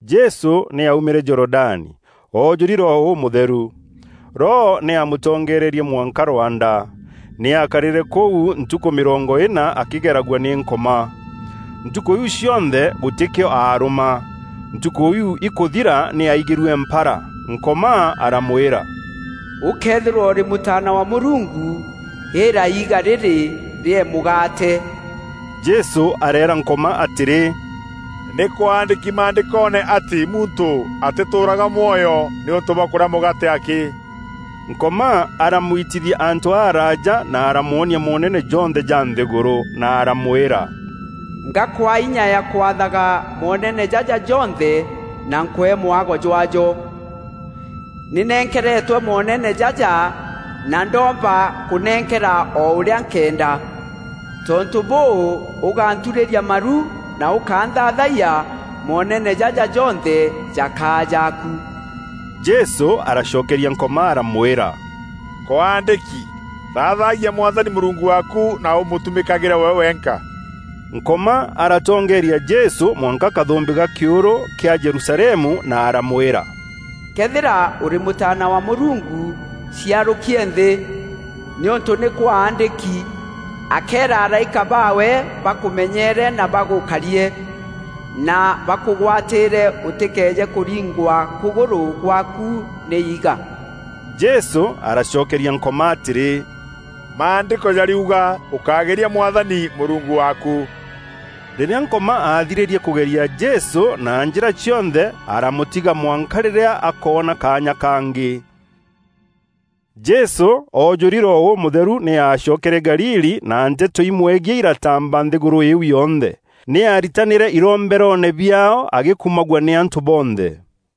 Jesû nî aumîre Jorodani, oojûri Roho Ûmûtheru. Roho nî aamûtongeererie mwanka rwanda. Nî aakarîre kû ntukû mîrongo îna akîgeragua nî Nkoma. Ntukû iu cionthe, gûtîkîo aarûma. Ntukû iu ikûthira nî aigîrue mpara. Nkoma aramwîra, “Ûkëethîrwa ûrî Mûtaana wa Mûrungu, îîra iiga rîrî rîee mûgaate.” Jesû areera Nkoma atîrî, “Nî kwaandîki Maandîkoone atî ‘Muntû atîtûûraga mwoyo nîûntû bwa kûrîa mûgaate akî.’” Nkoma aramwitithia antû araaja na aramwonia moonene jonthe ja nthîgûrû, na aramwîra, “Ngakwaa inya ya kwathaga moonene jaja jonthe na nkwee mwago jwaajo. Nî nenkeretwe moonene jaja na ndoomba kûnenkera o ûrîa nkeenda. Tontû bûû, ûgänturîrîa maru na ûkanthaathayia, moonene jaja jonthe jakaa jaaku.” Jesû aracokeria Nkoma aramwîra, “Kwaandîki, ‘Thaathagia Mwathani Mûrungu waaku, na ûmûtumîkagîre we wenka.’” Nkoma aratongeeria Jesû mwanka kathûmbî ka kîûrû kîa Jerusalemu na aramwîra, “Këethîra ûrî Mûtaana wa Mûrungu, ciarûkie nthî; nîûntû nî kwaandîki, ‘Akeera araîka baawe bakûmenyeere na bagûkarie’ na ‘bakûgwatîîre ûtîkeeje kûringwa kûgûrû gwaaku nî iiga.’” Jesû aracokeria Nkoma atîrî, “Maandîko jarîuga, ‘Ûkágeria Mwathani Mûrungu waaku.’” Rîrîa Nkoma aathirîrie kûgeria Jesû na njîra cionthe, aramûtiga mwanka rîrîa akoona kaanya kaangî. Jesû oojûri Roho Ûmûtheru nî aacokere Galili na nteto imwegiî iratamba nthîgûrû iu yonthe. Nî aaritanîre iromberoone biaao agîkumagua nî antû bonthe.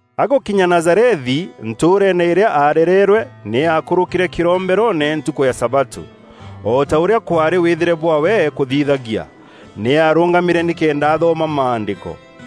Agûkinya Nazarethi, ntûûreene îrîa arereerwe, nî aakûrûkîre kîromberoone ntukû ya sabatû, o ta ûrîa kwaarî wîthîre bwaawe kûthithagia. Nî aarûngamîre nîkenda athoma Maandîko.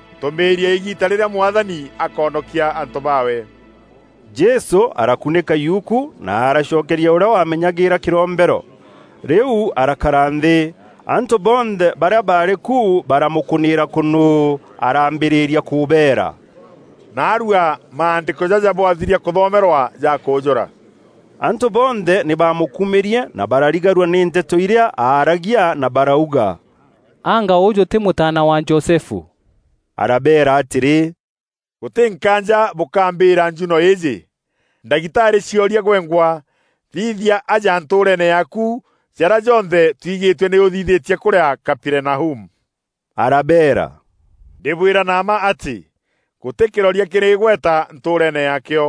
Ntûmîîrie îgiita rîrîa Mwathani akoonokia antû baawe.” Jesû arakunîka yuku, na aracokeria ûrîa waamenyagîîra kîrombero, rîu arakara nthî. Antû bonthe barîa baarî ku baramûkûnîîra kûnûû. Araambîrîria kûbeera, “Naarua Maandîko jaja bwathiria kûthomerwa jakûjûra.” Antû bonthe nî bamûkumîrie na bararigarua nî nteto irîa aaragia na barauga, “Anga ûjû tî mûtaana wa Josefu?” Arabeera atîrî, “Gûtî nkaanja bûkambîîra njuno îîjî, ‘Ndagitarî ciorie gwengwa; thithia aja ntûûreene yaaku jarîa jonthe twigîtue nî ûthithîtie kûûrîa Kaperinaumu.’” Arabeera, “Ndîbwîra na mma atî, gûtî kîroria kîrî îgweta ntûûreene yaakîo.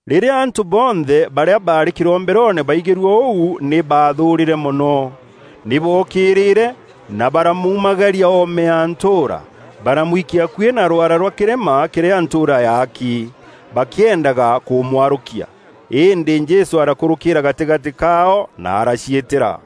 Rîrîa antû bonthe barîa baarî kîromberoone baigîrue ûu nî baathûûrîre mono. Nî bookîîrîre na baramuumagaria oome ya ntûûra. Baramwikia akuî na rwaara rwa kîrîma kîrîa ntûûra yaaki, bakîendaga kûmwarûkia. Îndî Jesû arakûrûkîîra gatîgatî kaao na araciîtîra.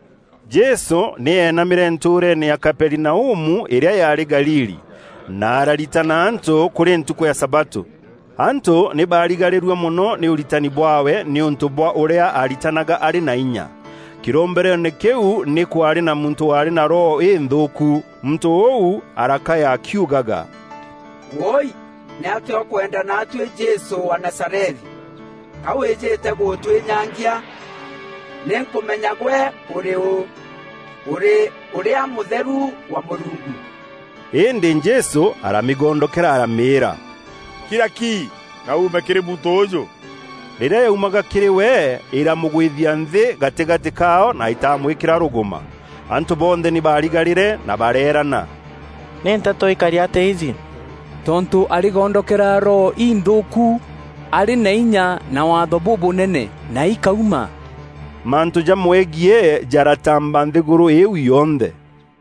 Jesû nî eenamîre ntûûreene ya Kaperinaumu, îrîa yaarî Galili, na araritana antû kûrî ntukû ya sabatû. Antû nî bararigarîrue mono nî ûritani bwaawe nîûntû bwa ûrîa ariitanaga arî na inya. Kîromberoone kîu nî kwaarî na muntû waarî na roho înthûûku. Muntû ûu arakaya akiugaga, “Wûûi! Nîatîa ûkwenda naatuî Jesû wa Nazarethi? Ka wîîjîte gûtwînyangia? Nînkûmenya gwe ûrî û. Ûrî Ûrîa Mûtheru wa Mûrungu.” Îndî Jesû aramîgondokera aramîîra, “Kira ki na uume kîrî muntû ûûjû!” Rîrîa yaumaga kîrî we, îramûgwithia nthî gatîgatî kaao na îtamwîkîra rûgûma. Antû bonthe nî baarigarîre na bareerana, “Nî nteto îkari atîa iji? Tontû arîgondokera roho inthûûku arî na inya na waatho bûbûnene, na ikauma!” Mantû jamwegiî jaratamba nthîgûrû îîu yonthe.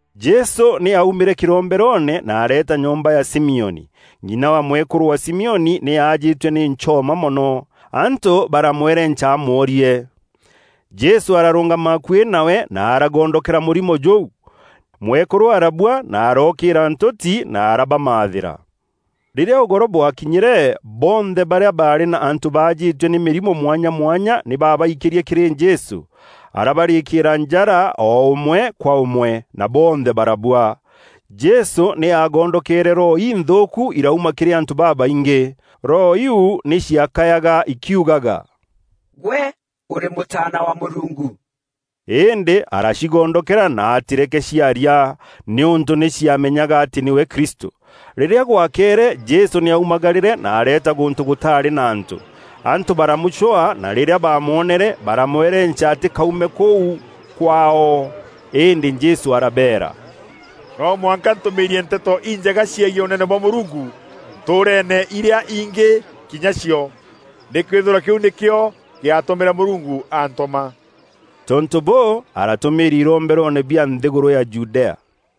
Jesû nî aumîre kîromberoone na areeeta nyomba ya Simioni. Ng'ina wa mwekûrû wa Simioni nî aajîtue nî nchoma mono. Antû baramwerenca amworie. Jesû ararûngama akuî nawe na aragondokera mûrimo jûu. Mwekûrû arabua na arookîîra ntûti na arabamathîra. Rîrîa ûgoro bwakinyîre, bonthe barîa baarî na antû baajîtue nî mîrimo mwanya mwanya nî babaikîrie kîrî Jesû. Arabarîkîîra njara o ûmwe kwa ûmwe, na bonthe barabua. Jesû nî agondokeere roho inthûûku irauma kîrî antû babaingî. Roho iu nî ciakayaga ikiugaga, “Gwe ûrî Mûtaana wa Mûrungu.” Îndî aracigondokera na atîreke ciaria, nîûntû nî ciamenyaga atî nîwe Kristû. Rîrîa gwakeere Jesû nî aumagarîre na areeta gûntû gûtaarî na antû. Antû baramûcwaa na rîrîa baamwonere, baramwerenca atîkaume kûu kwaao. Îndî Jesû arabeera, “No mwanka ntûmîîrie Nteto Injega ciegiî Ûnene bwa Mûrungu ntûûreene irîa ingî kinya cio. Nîkwîthîrwa kîu nîkîo gîatûmîre Mûrungu aantûma.” Tontû bûû, aratûmîîria iromberoone bia nthîgûrû ya Judea.